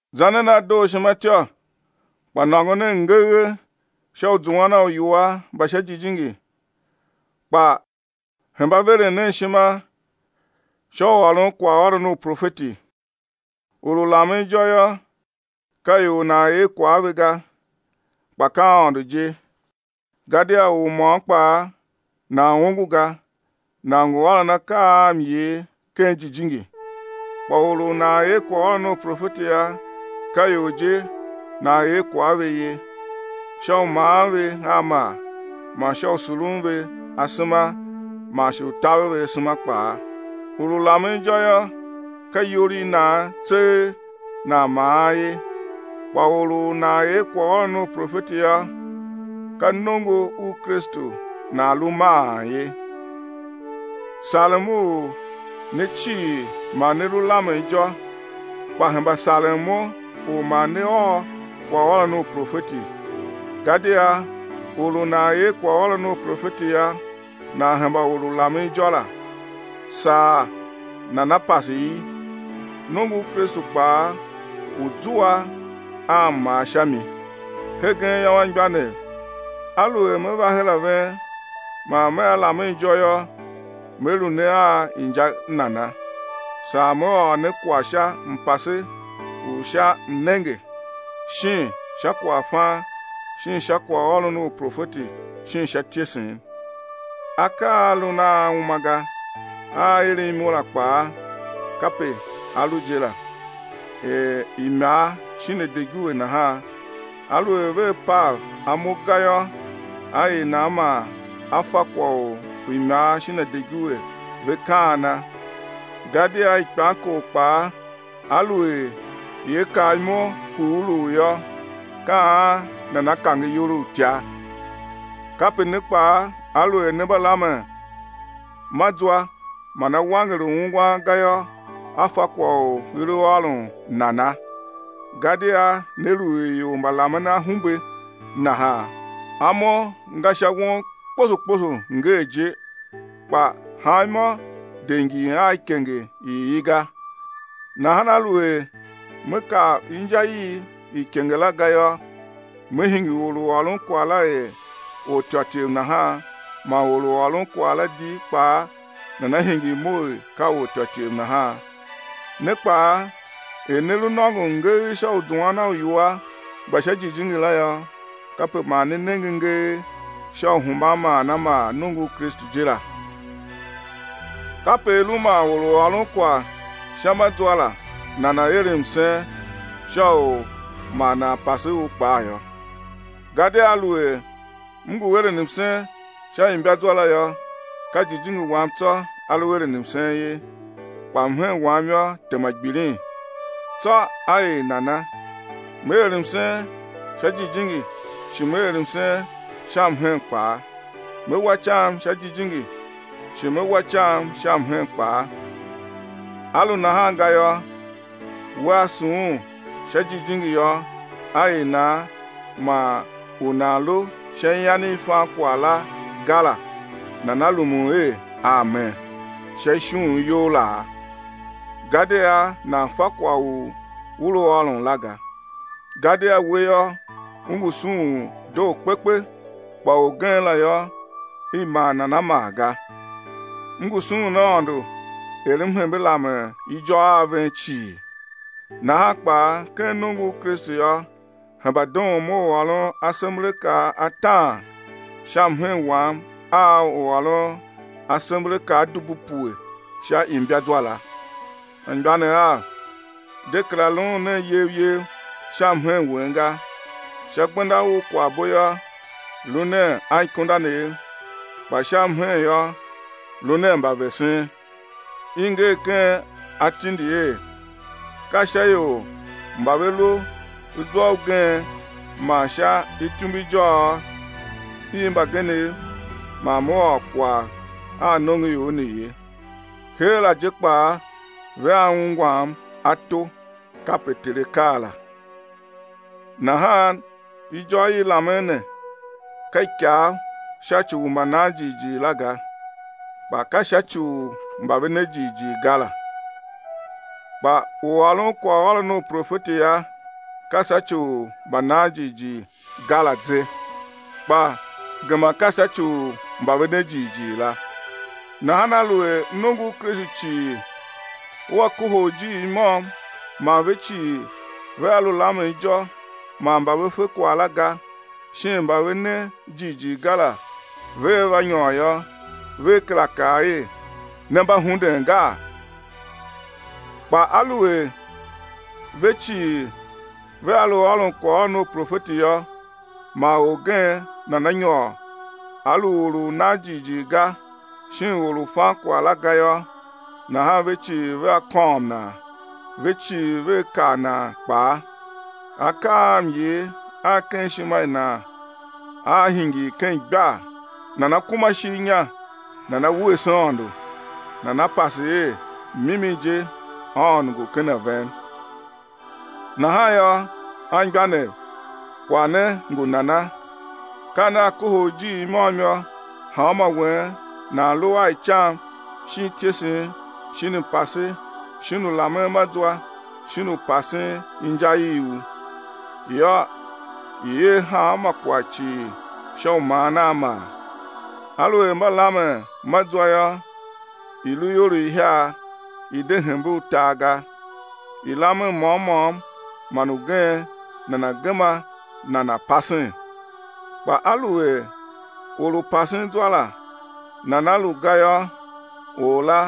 Za nen a dooshima ityô kpa nôngo nen ngegh sha u zuan a uiwua mba sha jijingi, kpa hemba veren nen ishima sha u ôron kwaghôron u profeti. Or u lamen ijô yô, ka ior nan er kwagh a ve ga, kpa ka Aôndo je, gadia or môm kpaa nan ongo ga, nan ngu ôron akaa a myer ken jijingi. Kpa or u nan er kwaghôron u profeti yô, ka ior je nan er kwagh a ve ye, sha u maan ve a maa man sha u surun ve asema man shi u taver ve asema kpaa. Or u lamen ijô yô, ka iyol i nan tseegh nan maan ye, kpa or u nan er kwaghôron u profeti yô, ka nongo u Kristu nan lu maan ye. Sarem u ne cii ma ne lu lamen ijô, kpa hemba saren mo u ma ne ôr kwaghôron u profeti. Gadia or u nan er kwaghôron u profeti yô, nan hemba or u lamen ijô la, saa nana̱ pase i, nongo u Kristu kpaa, u̱ zua a mmaa sha mi. Hegen yô, anmgbianev, aluer me va her a ven man mea lamen ijô yô, me lu ne a inja nana, saa me ôr ne kwagh sha mpase u sha mnenge shin sha kwaghfan shin sha kwaghôron u profeti shin sha ityesen. Akaa a lun a uma ga, a a eren imo la kpaa, kape a lu je la, er imar shin adiguve nahan, aluer vea pav imo ga yô, á er nan man á fa kwagh u imar shin adiguve ve kaana? Gadia ikpamkor kpaa, aluer ia kaa imo hughuluu yô, ka an nana kange iyol i utya? Kape ne kpaa aluer ne mba lamen ma zwa man á wanger u ungwan ga yô, á fa kwagh u i lu ôron nana? Gadia né lu er ior mba lamen a ahumbe nahan. Amo nga sha won kposo kposo ngee je, kpa hanmô de ngin a ikenge i i ga. Nahan aluer me kar inja i ikenge la ga yô, me hingir or u ôron kwagh la er ortyôtyev nahan man or u ôron kwagh la di kpaa nana hingir mo er ka ortyôtyev nahan. Ne kpaa er ne lu nôngon ngegh sha u zuan a uiwua mba sha jijingi la yô, kape ma ne nenge ngegh sha u hemban maan a maa nongo u Kristu je la. Kape i lu man or u ôron kwagh sha ma zwa la nana̱ er msen sha u ma nan pase u kpaa yô. Gadia aluer m ngu eren msen sha imbazwa la yô, ka jijingi wam tsô a lu eren msen ye, kpa mhen wam yô, tema gbilin. Tsô á er nana? Me er msen sha jijingi shi me er msen sha mhen kpaa. Me wa icam sha jijingi, shi me wa icam sha mhen kpaa. A lu nahan ga yô, wea sughun sha jijingi yô, á er nan man u nan lu sha ian i fan kwagh la ga la, nana rumun er, “Amen” sha ishughun you laa? Gadia nan fa kwagh u u lu ôron la ga. Gadia we yô, u ngu sughun doo kpekpe, kpa orgen la yô, i maa nan a maa ga. M ngu sughun Aôndo er m hembe lamen ijô a ven cii yô. Nahan kpaa, ken nongo u Kristu yô, hemba doon mo u ôron asemberakaa ataan sha mhen wam a u ôron asemberakaa dubu pue sha imbazwa la. Anmgbianev av, de kera luun nen yev yev sha mhen wen ga; sha gbenda u kwaghbo yô, lu nen anikundanev, kpa sha mhen yô, lu nen mbavesen. I nger ken atindi er: Ka sha ior mba ve lu zwa ugen man sha ityumbujôôgh i mbagenev man Me ôr kwagh a nongoior ne ye. Heera je kpaa vea ungwa ato, kape Ter A kaa la. Nahan ijô i lamen ne ka ikav sha ci u mbananjighjigh la ga, kpa ka sha ci u mba ve ne jighjigh ga la. Kpa u ôron kwaghôron u profeti yô, ka sha ci u mbanan jighjigh ga la ze, kpa gema ka sha ci u mba ve ne jighjigh la. Nahan aluer nongo u Kristu cii ua kohol ijiir i môm man ve cii vea lu lamen ijô man mba ve fe kwagh la ga, shin mba ve ne jighjigh ga la vea va nyôr yô, vea kera kaa er ne mba hunden gaa? Kpa aluer ve cii vea lu ôron kwaghôron u profeti yô, man orgen nana nyôr, a lu or u nan jighjigh ga, shin or u fan kwagh la ga yô, nahan ve cii vea kôôm nan, ve cii vea kar nan kpaa, akaa a myer a ken ishima i nan aa hingir ken igbar, nana kuma ishigh inya nana wuese Aôndo, nana pase er, mimi je Aôndo ngu ken a ven. Nahan yô, anmgbianev, kwagh ne ngu nana? Ka nea kohol ijiir i môm yô, hanmô wen nan lu a icam shin ityesen shin mpase shin u lamen ma zwa, shin u pasen inja i u. Yô, i̱ er hanma kwagh cii sha u maan a maa. Aluer mba lamen ma zwa yô, i̱ lu ior ihiar, i̱ de hembe utar ga, i̱ lamen môm môm man ugen nana̱ gema nana̱ pasen. Kpa aluer or u pasen zwa la nana lu ga yô, or la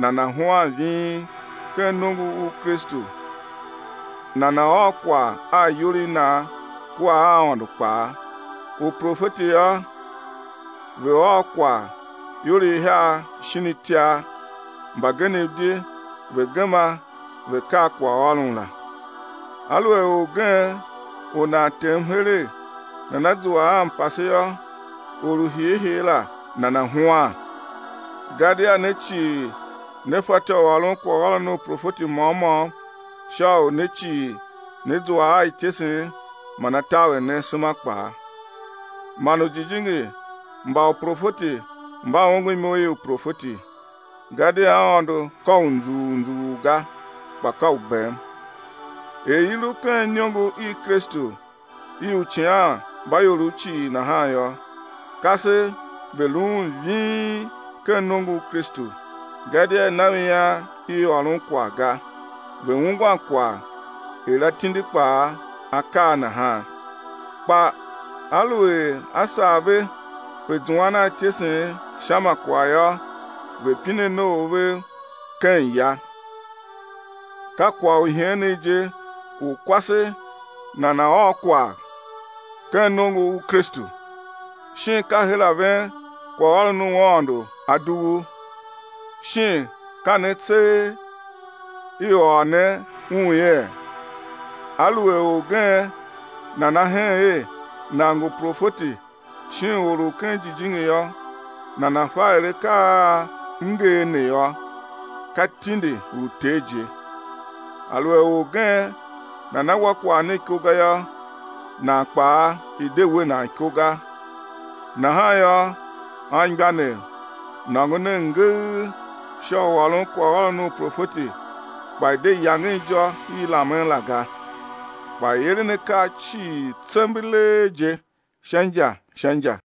nana̱ huan ving ken nongo u Kristu nana̱ ôr kwagh a iyol i nan kua a Aôndo kpaa. Uprofeti yô, ve̱ ôr kwagh, ior ihiar shin itiar, mbagenev di ve̱ gema ve̱ kar kwaghôron la. Aluer orgen u nan tem heregh nana zua a mpase yô, or u hiihii la nana̱ huan. Gadia ne cii ne fatyô u ôron kwaghôron u profeti môm môm, sha u ne cii ne zua a ityesen man á taver ne asema kpaa. Man ujijingi mba uprofeti mba ongo imo i uprofeti. Gadia Aôndo ka u nzughul nzughul ga, kpa ka u bem. Er i lu ken iniongo i Kristu i u icighanmbaiorov cii nahan yô, kasev ve̱ luun ving ken nongo u Kristu. Gadia i na ve ian i ôron kwagh ga, ve̱ ungwan kwagh, er atindi kpaa a kaa nahan. Kpa aluer a sar ve pe zuan a ityesen sha ma kwagh yô, ve̱ pine noov vev ken ya. Ka kwagh u iheenegh je u kwase nana ôr kwagh ken nongo u Kristu. Shin ka her a ven kwaghôron u Aôndo a dughu? Shin ka ne tseegh i ôr ne un yee? Aluer orgen nana hen er nan ngu profeti shin or u ken jijingi yô, nana̱ fa er akaa a m nger ne yô, ka tindi u Ter je. Aluer orgen nana wa kwagh ne iko ga yô, nan kpaa i̱ de we nan iko ga. Nahan yô, anmgbianev, nôngo nen ngegh sha u ôron kwaghôron u profeti kpa i̱ de yangen ijô i lamen la ga. Kpa i̱ eren akaa cii tsembelee je, sha inja sha inja.